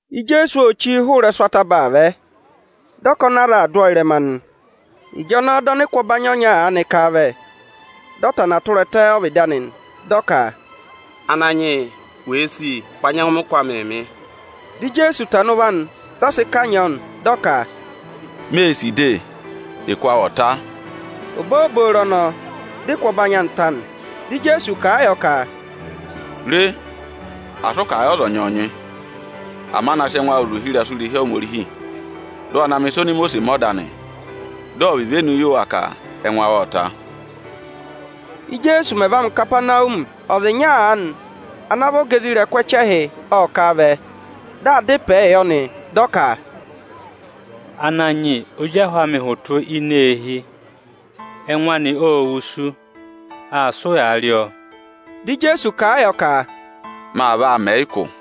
Ijeesu ô chí hụrẹ ịrẹsụ ataba aa vẹ, dị ọkọnị aza aa dụ ọ ịrẹma nị. Ịjọnọọ dị ọnịkụ ọbanyị ọnya aanị ká a vẹ, dị ọ va ku ẹtẹ ọ́vịdị anị, dị ọ ka, “Ananyị yị, wèe sì, wa nyẹngụ mẹ ụkụ amịị mị.” Dị Ijeesu tana ụvọ anị, dị ọ sị kanyị ọ nị, dị ọ ka, “Mee sì de, ụkụ awụ ọ̀ ta!” Obooboro ọnọọ, dị ụkụ ọbanyị anị ta nị. Dị Ijeesu kà a yọ ka, “Re, asị ụ kà a yị ọza ọnyọọnyị! Ama na sị ẹngụ awụ zụ̀ ohirẹsụ irehi ahẹkẹ Aniju; dị ụ wa na mẹ̀ ịsọvọ oni Imosiisi mẹ ọda anị, dị ọ̀ vị ivenu yị wa ka ẹngụ awụ ộ ta!” Íjeesu mẹ̀ va ngụ Ikapanawumi, ọza ịnya aanị ana vị ọga isoja ẹchẹhị ộ kà vẹ, dị aa dá ịpẹẹ yọ nị, dị ọ ka, “Ananyị yị, ozi ahụ amị hụtụ ini eehi, ẹngụ anị ô wusu, aa sị ụyaa rị ọọ.” Dị Ijeesu kà a yọ ka: ọnị aa vaa mẹ̀ ẹ ụkụ nị.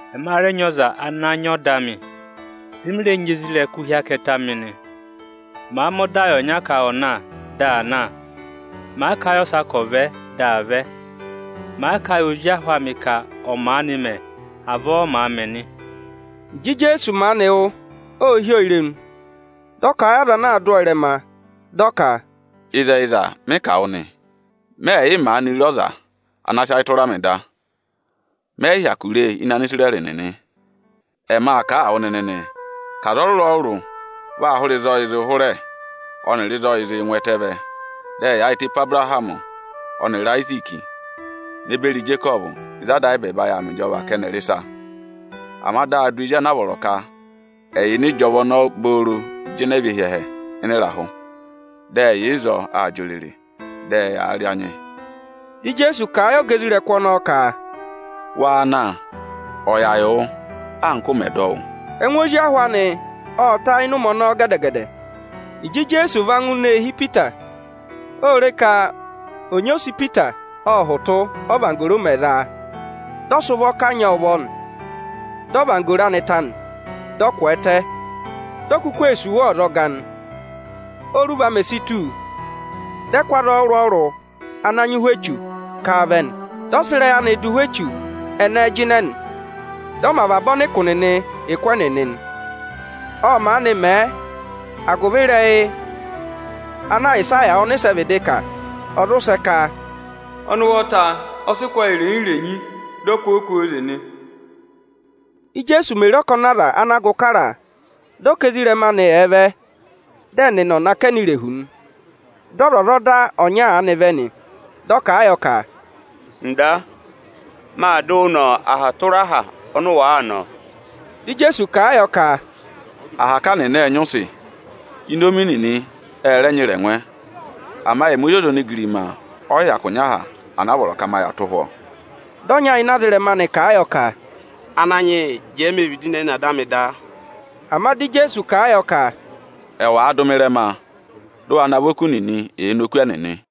Ẹma rẹ nyị ọza ana nyị ọda amị, dị mị rẹ nyị isoja nịnị hi akẹtẹ amị nị. Màa mẹ ọda yị ọnya ka ọ̀ na, dị aa na; màa kà a yị ọsa ka ọ̀ vẹ, dị aa vẹ. Màa kà a yị ozi ahụ amị ka ọ̀ maanị mẹ, avọọ ọ màa mẹ nị.” Ịjị Ijeesu maanị wụ́, ô hí ọ irenu, dị ọ kà a yị aza ana aa dụ ọ ịrẹma, dị ọ ka, “Ịzẹyịza, mị kà a wụ nị, mẹ yị maanị re ọza ana sị ayị tụra mị da; mẹ yị hyakụ ree ịnị Anisirẹrị nịnị. [Ẹma kà a wụ nịnị nị ka aza ọrụrụ-ọrụrụ vaa hụrẹ ịzị ọyịị̄ zịị hụrẹ ọnịrị ịzị ọyịị̄ zịị ngụ ẹtẹẹ vẹ, dị ẹ yaayịtẹ pe Abụrahamị ọnịrị Ayiziiki ne beri Ijekọvụ ịzị Ada ayị ẹbẹẹba yà aa mẹ ịjọva ka ẹnị ẹ̀ rị ịsa.] Ama dị a dụ ezi anaa vọrọ ka ẹ̀ yà ịnị ịjọva ọnọọ obooro jịnẹ và hi ẹhẹ ịnị ịrahụ. Dị ẹ yà ịzọọ aa jị òrèrè, dị ẹyaa rị anyị.” Dị Ijeesu kà a yị ọga isoja nịnị ọnọọ ka, “Waa na, ọ̀ yà yị wụ, anka ụ mẹ̀ dọ wụ́.” Dị ẹngụ ozi ahụ anị ta ịnị ụmẹ ọnọọ gẹdẹ-gẹdẹ nị. Ịjị Ijeesu va ngụ ini eehi Ipita, ô re ka ọnyị ose Ipita ộ hụtụ, ọ́vanggoro mẹ̀ za a. Dị ọ sị ụvọ kanyị ọọ ụvọ nị; dị ọvanggoro anị ta nị. Dị ọ kwẹẹtẹ, dị ọ kụkụ ee sì wa ọzọga nị. Óruva mè si tù, dị ẹ kụ́ aza ọrụrụ-ọrụrụ ana nyị ụhwẹ echu ká a vẹ nị. Dị ọ sị ịrẹyị anị dụ ụhwẹ echu ẹnẹẹ jịnẹ nị, dị ọ mẹ avaba ọnịkụ nịnị ụkụ ẹnịnị nị. Ộ maanị mẹ, agụvị ịrẹyị ana Ayịsaya ọnịsẹ vịdị kà, ọ̀ zụ sẹ ka, “Ọnị ụvọta ộ sị ụkụ ayị irenyi-renyi, dị ọ kụ́ ọọ kwooze nị.” Íjeesu mè re ọkọnị aza ana gụ kara a, dị ọ ka ezirẹma anị ẹ̀ vẹ, dị ẹnị ẹ̀ nọ akẹnẹ irehu nị. Dị ọzwọzọda ọnya aanị vẹ nị, dị ọ kà a yọ ka, “Ịnda, maa dụ wụ nọ aha tụra aha ọnị ụ wàa nọ.” Dị Ijeesu kà a yọ ka, “Ahaka nịnị ệ nyị ụsị; inomi nịnị ẹ rẹ nyị ịrẹngwẹ, ama ẹmị Ozi ọza onigirima ọ yị hyakụ nyị aha ana vọrọ ka ma yà tụ́ ụhwọ́.” Dị ọnya ịnị ezirẹma anị kà a yọ ka, “Ananyị yị, jẹẹ me vịdị ne ne ada amị da.” Ama dị Ijeesu kà a yọ ka, “Ẹwụ àa dụ mị ịrẹma, dụ wa navọ oku nịnị èe ne oku ẹnịnị!”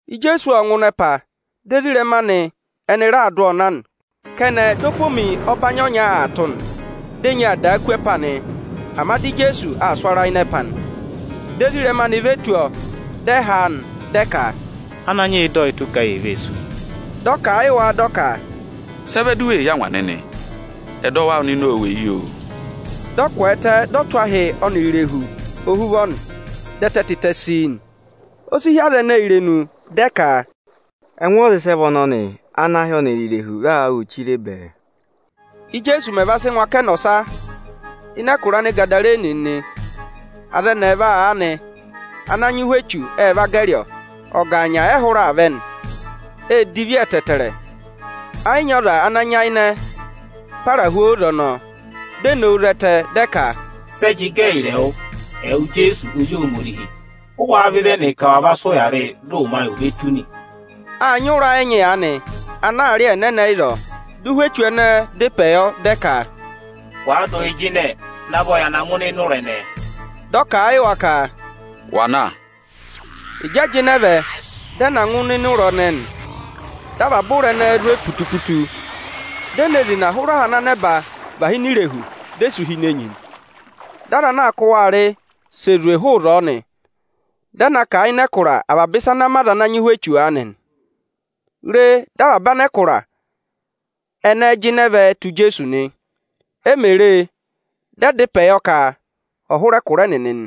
Ijeesu ộ ngụ ịnị ẹpa, dị ezirẹma anị ẹnị raa dụ ọọ na nị. Kẹnẹ, dị opomi ọbanyị ọnya aa tụ́ nị, dị enyi aa dàa kú ẹpa nị, ama dị Ijeesu aa sụ ara ịnị ẹpa nị. Dị ezirẹma anị ve tù ọọ, dị ẹ haa nị, dị ẹ ka, “Ananyị yị, dọ yị tụ́, ka yee vee sú!” Dị ọ kà a yị wa, dị ọ ka, “Sị ẹ vẹ du wee hí angwa nịnị? Ẹdọwụ awụ nịnị ô weyi, oo!” Dị ọ kwẹẹtẹ, dị ọ tụ́ ahị ọnịrị irehu ohuvọ nị, dị ẹtẹ tịtẹ sii nị. O si hí aza ẹnẹẹ irenu, dị ẹ ka, “Ẹngụ ọza ịsị ẹ vị ọnọnị ana ahị ọnịrị irehu raa wụ́ chiree bẹẹ?” Ijeesu mẹ̀ va sị ngụ akẹnẹ ọsa ịnị ẹkụra Anịgadarene nịnị, aza ẹnị ẹẹva aanị ana nyị ụhwẹ echu ẹ va gẹrị ọọ. Ọgaanya ẹ hụrẹ aa vẹ nị. Ê divi ẹtẹẹtẹrẹ, ẹyị nyị ọza ana nyayịnẹ para hu óze ọnọọ. Di e nowu zẹtẹ, dị ẹ ka, “Sẹ jị gẹ ẹyịrị ẹwụ, ẹwụ Ijeesu Ozi Ohomorihi? Ụ wáá vẹ ịzẹnị ka wa va sị ụya rị yị, dị ụmẹ ò ve tù nị?” Â nyị ụ̀rá ẹnyị aanị ana aa rị ẹ́nẹẹnẹ ịzọọ. Dị ụhwẹ echu ẹnẹẹ dá ịpẹ yọ, dị ẹ ka, “Wàa dụ yị jịnẹ, navọ ya na ngụ ịnịnẹ ụra ẹnẹẹ!” Dị ọ kà a yị wa ka, “Wa na nịnị!” Ịjị ẹ jịnẹ vẹ, dị ẹ na ngụ ịnịnẹ ụ̀rá ẹnẹẹ nị. Dị avaba ụ̀rá ẹnẹẹ zwe putu-putu, di e ne zina hụrẹ aha ana nẹba và hí ini irehu, di e sú hi ini enyi nị. Dị aza ana aa kụ́ wa rị si zwe hụụ ịzọọ nị. Dị ẹ na kà a ịnị ẹkụra avaba ịsa ana mẹ aza ana nyị ụhwẹ echu aanị nị. Re, dị avaba anẹkụra ẹnẹẹ jịnẹ ve tù Ijeesu nị. E mè re e, dị ẹ dá ịpẹ yọ ka ọ̀ hụrẹ ẹkụra ẹnịnị nị.